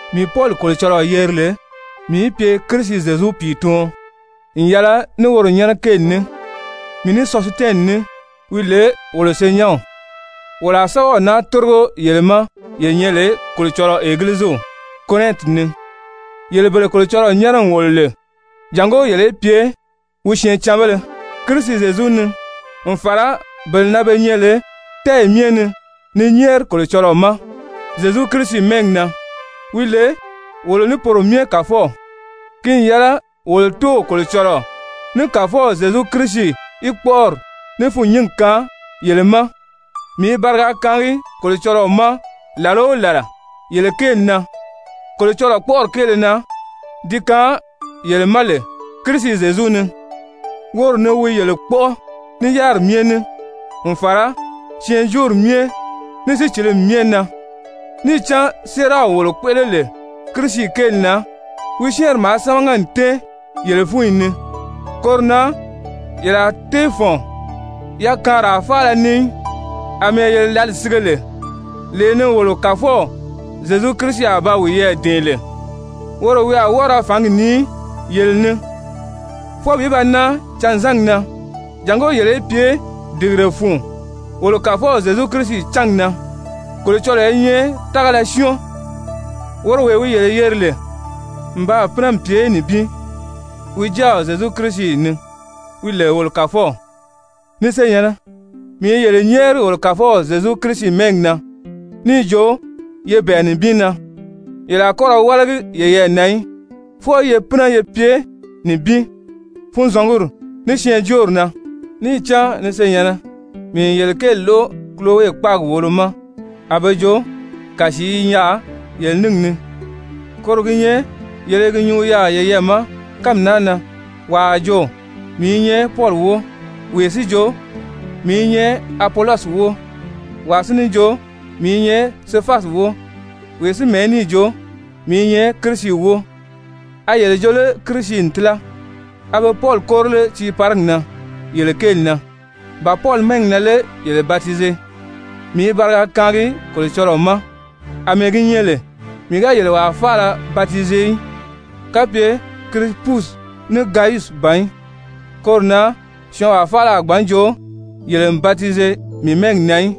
Mii Pɔli Kolocɔlɔɔ yeri lè mii í pye Kirisi Zyezu pìituɔn n yɛlɛ ní woro nyɛ́nɛ kéeli ní, mii ní Sɔsitɛni ní, wi lè wolo senyɛnw, wolo a sɛ́bɛw naa tórigo yele ma ye nyɛ lè Kolocɔlɔɔ Egiliziw Korɛnti ni, yele bele Kolocɔlɔɔ nyɛ́nɛ n wòlo lè jàngó yele í pye wi syɛɛncanbéle Kirisi Zyezu ni n fàra bele na be nyɛ lè tɛ́ɛyi myɛ ni ni nyɛ́ɛri Kolocɔlɔɔ ma Zyezu Kirisi mɛ́ɛgi na, wi lè wolo ní poro myɛ Kàfɔw. Ki n yɛlɛ wolo Tóow Kolocɔlɔɔ ní Kàfɔw Zyezu Kirisi í kpɔ́ʔɔri ní fûnnyingi kaan yele ma! Mii i bariga kaangi Kolocɔlɔɔ ma làla o làla yele kéeli na, Kolocɔlɔɔ kpɔ́ʔɔri kéele na di kaan yele ma lè Kirisi Zyezu ni, woro ni wi yele kpɔ́ʔɔ ní yáriri myɛ ní, n fàra syɛɛnjóori myɛ, ní sícilimi myɛ na. Níì cán séeraw wolo kpéʔele lè Kirisi kéeli na, wi syɛ́ɛnri maa sámaga n tɛ́ɛn yele fúnyi ni. Koro na yele a tée fɔ̀n yakaanraa faala ni í, àmɛɛ yele lǎli sige lè, lee ni wolo Kàfɔw Zyezu Kirisi a ba wiyɛɛ dɛ̀ɛn lè. Woro wi a wɔ́ɔ ra fǎngi nii yele ni fwɔɔ bi ba nan canzangi na, jàngó yele í pye dìgire fun wolo Kàfɔw Zyezu Kirisi cángi na. Kolocɔlɔɔ i nyɛ tágala syɔ́ɔn, woro wee wi yele yeri lè n baa pínɛ n pye nibin wi Jáaw Zyezu Kirisi ni, wi lè wolo Kàfɔw. Ni senyɛ̀nnɛ, mii i yele nyɛ́ɛri wolo Kàfɔw Zyezu Kirisi mɛ́ɛgi na níì jo ye bɛ̀ɛ nibin na, yele a kɔ́ ra wálagi yeyɛɛ na í, fwɔɔ ye pínɛ ye pye nibin, funzɔnguri ní syɛɛnjóori na. Níì cán ni senyɛ̀nnɛ, mii n yele kéeli lóʔo Kulowe kpáagi wòolo ma, a be jo kàsii i yaà yele níngi ni. Koro gi nyɛ yele i gi nyuu yaà yeyɛɛ ma kánmi naa na: «Wàa a jo: ‹Mii i nyɛ Pɔli wóo!› Wee si jo: ‹Mii i nyɛ Apolɔsi wóo!› Wàa si ní jo: ‹Mii i nyɛ Sefasi wóo!› Wee si mɛ̀ɛ́ níì jo: ‹Mii i nyɛ Kirisi wóo!›» A yele jo lé Kirisi n tíla? A be Pɔli kóri lé tiiparigi na yele kéeli na? Ba Pɔli mɛ́ɛgi na lé yele batize? Mii i bariga kaangi Kolocɔlɔɔ ma àmɛɛ gi nyɛ lè mii ga yele wàa faala batize í, kapye Kirisipusi ní Gayusi ban í. Koro na syɔɔnwaa faala a gbǎn joo yele n batize mii mɛ́ɛgi na í.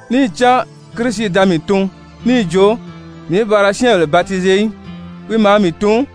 Níì cán Kirisi da mii tun níì jo mii í ba ra syɛ́ɛnbèle batize í, wi maa mii tun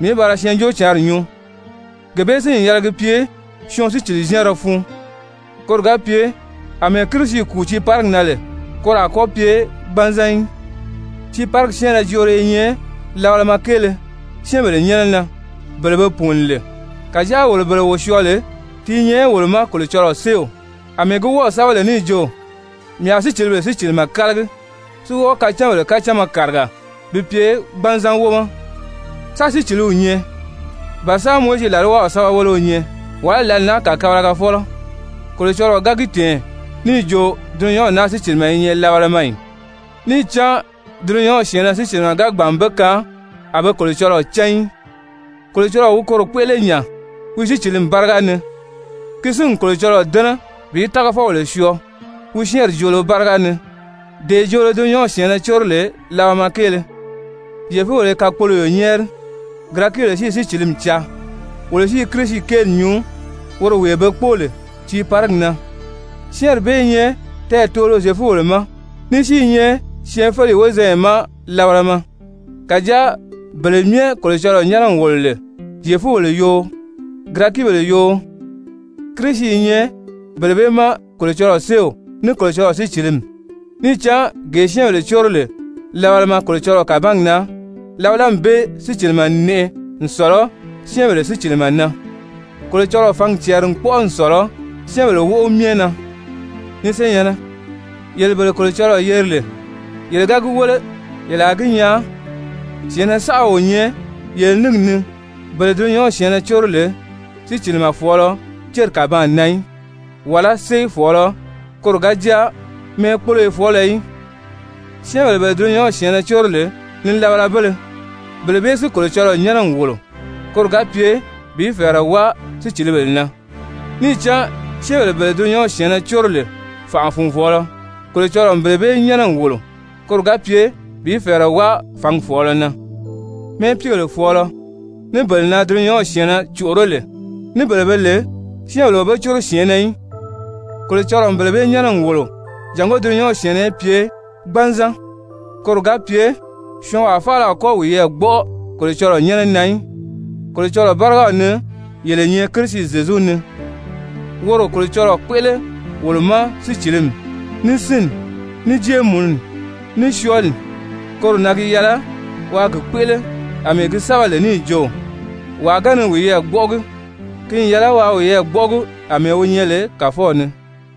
mii í ba ra Syɛɛnjóocǎnri nyuu, gee bee si n yɛlɛ gi pye syɔɔn sícili-zyɛ́ɛnrɛ fun, koro ga pye àmɛɛ Kirisi kùu tiiparigi na lè, koro a kɔ́ pye gbanzan í. Tiiparigi syɛ́ɛnrɛ joolo i nyɛ labalama kéele syɛ́ɛnbèle nyɛ́nɛ na, bele be pùuni lè. Kàjáa wolo bele wo syɔɔ lè, ti i nyɛ wolo ma Kolocɔlɔɔ séew. Amɛɛ gi wɔ́ɔ̀ sɛ́bɛ lè níì jo: «Mii a sícilibèle sícilimɛ kálagi, si wɔ́ɔ kacánbèle kacánma kàriga bi pye gbanzan wómɔ.» Sán síciliw nyɛ? Ba sán Mowizi làlwaw sɛ́bɛweleo nyɛ? Wàlá lǎli naa kàkabalagafɔlɔ? Kolocɔlɔɔ ga gi tɛ̀ɛn níì jo dulunyanw naa sícilimɛ i nyɛ labalama ì? Níì cán dulunyanw syɛ̀ɛnnɛ sícilimɛ ga gbàn n be kaan a be Kolocɔlɔɔ cán í, Kolocɔlɔɔ wi koro kpéʔele nya wi sícilimi báriga ni, ki si n Kolocɔlɔɔ dɛ́nɛ bi tágafɔbèle syɔɔ wi syɛ́ɛnri joolo báriga ni, dee joolo dulunyanw syɛ̀ɛnnɛ córo lè labalama kéele. Zyefubèle i kakpoloyo nyɛ́ɛri, Girɛkibèle si i sícilimi caa. Wolo si i Kirisi kéeli nyuu woro wee be kpóo lè tiiparigi na, syɛ́ɛnri bee i nyɛ tɛɛtoolo Zyefubèle ma, ní si i nyɛ syɛɛnfeleyi wozanya ma labalama, kàjáa bele myɛ Kolocɔlɔɔ nyɛ́nɛ n wòlo lè Zyefubèle yoo, Girɛkibèle yoo, Kirisi i nyɛ bele bee ma Kolocɔlɔɔ séew ní Kolocɔlɔɔ sícilimi. Níì cán gee syɛ́ɛnbèle córo lè labalama Kolocɔlɔɔ kàbangi na, labalami bee sícilimɛ n nɛʔɛ n sɔ̀lɔ syɛ́ɛnbèle sícilimɛ na, Kolocɔlɔɔ fǎngi cɛɛri n kpɔ́ʔɔ n sɔ̀lɔ syɛ́ɛnbèle wóʔo myɛ na. Ni senyɛ̀nnɛ, yele bele Kolocɔlɔɔ yeri lè, yele ga gi wéle yele a gi nyaa syɛ̀ɛnnɛ saʔa o nyɛ yele níngi ni bele dulunyanw syɛ̀ɛnnɛ córo lè sícilimɛ fɔ̀ɔlɔ céri kàbaan na í, wàlá sée fɔ̀ɔlɔ, koro ga jáa mɛ́ɛkpoloyofɔɔlɔ í. Syɛ́ɛnbèle bele dulunyanw syɛ̀ɛnnɛ córo lè nilabalabéle, bele bee si Kolocɔlɔɔ nyɛ́nɛ n wòlo, koro ga pye bi fɛ̀ɛrɛ wáa sícilibèle na. Níì cán syɛ́ɛnbèle bele dulunyanw syɛ̀ɛnnɛ córo lè fànʔa-fùnvɔɔlɔ, Kolocɔlɔɔ n bele bee nyɛ́nɛ n wòlo koro ga pye bi fɛ̀ɛrɛ wáa fǎngi fɔ̀ɔlɔ na. Mɛ́ɛpiigèle fɔ̀ɔlɔ, ní bele na dulunyanw syɛ̀ɛnnɛ còʔoró lè, ní bele be lè syɛ́ɛnbèle o be córo syɛ̀ɛnnɛ í, Kolocɔlɔɔ n bele bee nyɛ́nɛ n wòlo jàngó dulunyanw syɛ̀ɛnnɛ í pye gbanzan, koro ga pye syɔɔnwaa faala a kɔ́ wiyɛɛ gbɔ́ʔɔ Kolocɔlɔɔ nyɛ́nɛ na í. Kolocɔlɔɔ bárigaw ni yele nyɛ Kirisi Zyezu ni, woro Kolocɔlɔɔ kpéʔele wolo ma sícilimi, ní sínni, ní jéemununi, ní syɔɔli, koro na gi yɛlɛ waa gi kpéʔele àmɛɛ gi sɛ́bɛ lè níì jo: «Wàa ga ni wiyɛɛ gbɔ́ʔɔgi, ki n yɛlɛ waa wiyɛɛ gbɔ́ʔɔgi àmɛɛ wi nyɛ lè Kàfɔw ni.»